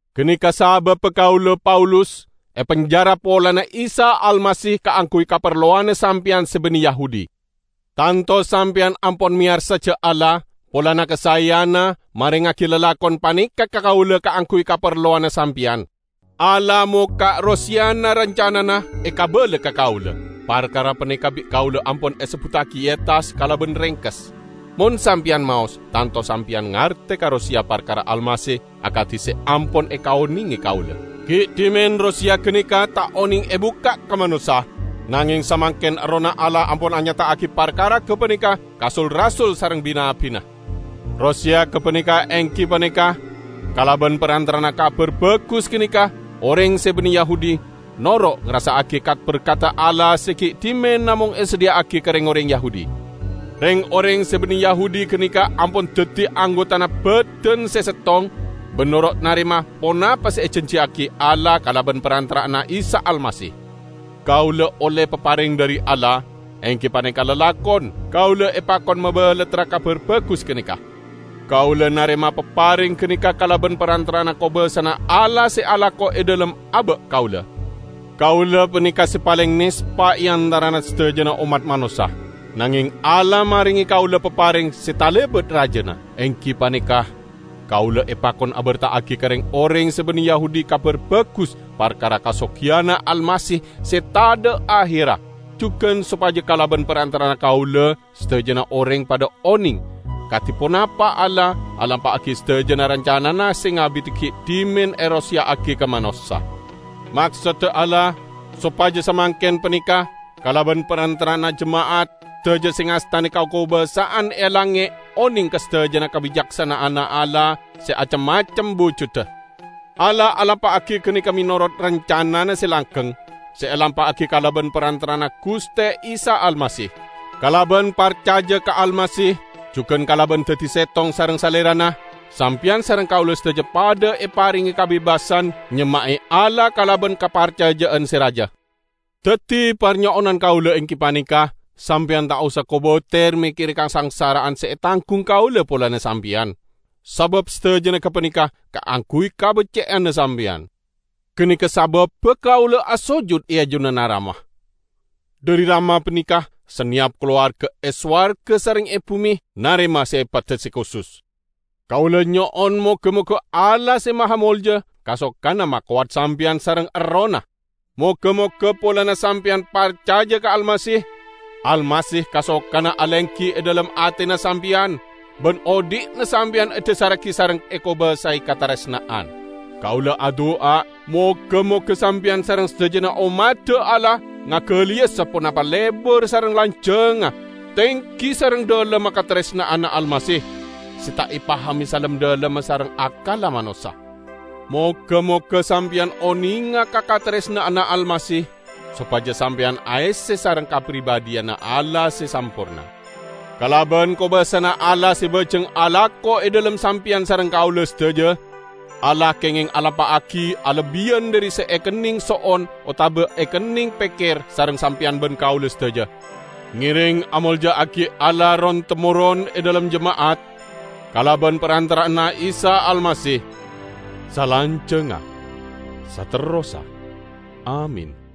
Ganeka sababba kaula, Paulus, epenjara polana Isa Almasih kaangguy kaparlowanna sampeyan se banne Yahudi. Tanto sampeyan ampon meyarsa ja' Allah, polana kasaeyanna, marengngagi lalakon paneka ka kaula kaangguy kaparlowanna sampeyan. Allah mokka' roseyana rancanana, ekabala ka kaula. (Parkara paneka bi' kaula ampon esebbuttagi e attas kalaban rengkes; mon sampeyan maos, tanto sampeyan ngarte ka roseya parkara Almasih akadi se ampon ekaonenge kaula.) Gi' dhimen roseya ganeka ta' oneng ebukka' ka manossa, nangeng samangken Errohna Allah ampon anyata'agi parkara gapaneka ka sul-rasul sareng bi-nabbina. Roseya gapaneka enggi paneka: Kalaban parantara'anna Kabar Bagus ganeka, oreng se banne Yahudi noro' ngarassa'agi kat-berkadda Allah se gi' dhimen namong esadhiya'agi ka reng-oreng Yahudi. Reng-oreng se banne Yahudi ganeka ampon daddi anggotana badan se settong, ban noro' narema ponapa se ejanjiyagi Allah kalaban parantara'anna Isa Almasih. Kaula olle papareng dhari Allah -- enggi paneka lalakon -- kaula epakon mabalattra Kabar Bagus ganeka. Kaula narema papareng ganeka kalaban parantara'anna kobasana Allah se alako e dhalem aba' kaula. Kaula paneka se paleng nespa e antarana sadajana ommat manossa. Nangeng Allah marenge kaula papareng se talebat rajana, enggi paneka: kaula epakon aberta'agi ka reng-oreng se banne Yahudi Kabar Bagus parkara kasogiyanna Almasih se tadha' aherra, jugan sopaja kalaban parantara'anna kaula sadajana oreng padha oneng kadi ponapa Allah, alampa'agi sadajana rancanana se ngabidi gi' dhimen eroseya'agi ka manossa. Maksodda Allah, sopaja samangken paneka, kalaban parantara'anna jema'at, sadaja se ngastane kakobasa'an e langnge' oneng ka sadajana kabicaksana'anna Allah se acem-macem bujudda. Allah alampa'agi ganeka menorot rancanana se langgeng, se elampa'agi kalaban parantara'anna Guste Isa Almasih. Kalaban parcaja ka Almasih jugan kalaban daddi settong sareng Salerana, sampeyan sareng kaula sadaja padha eparenge kabebasan nyemma'e Allah kalaban kaparcaja'an se raja. Daddi, parnyo'onan kaula enggi paneka: sampeyan ta' osa kobater mekkere kasangsara'an se etanggung kaula polana sampeyan, sabab sadajana gapaneka kaangguy kabecce'anna sampeyan. Ganeka sababba kaula asojut e ajunanna Rama. Dhari Rama paneka saneyap kalowarga e sowarga sareng e bume narema sepadda se kusus. Kaula nyo'on moga-moga Allah se mahamolja kasokana makowat sampeyan sareng Errohna. Moga-moga polana sampeyan parcaja ka Almasih, Almasih kasokana alenggi e dhalem atena sampeyan, ban odhi'na sampeyan edhasarragi sareng ekobasae kataresna'an. Kaula adu'a moga-moga sampeyan sareng sadajana ommadda Allah, ngagaliya saponapa lebar sareng lanjangnga, tenggi sareng dhalemma kataresna'anna Almasih, se ta' epahame salem-dhalemma sareng akkalla manossa. Moga-moga sampeyan onenga ka kataresna'anna Almasih, sopaja sampeyan aesse sareng kapribadhiyanna Allah se samporna. Kalaban kobasana Allah se bajeng alako e dhalem sampeyan sareng kaula sadaja, Allah kengeng alampa'agi alebbiyan dhari se ekenneng so'on otaba ekenneng pekker sareng sampeyan ban kaula sadaja. Ngereng amolja'agi Allah ron-temoron e dhalem jema'at, kalaban parantara'anna Isa Almasih, salanjangnga, saterrossa! Amin.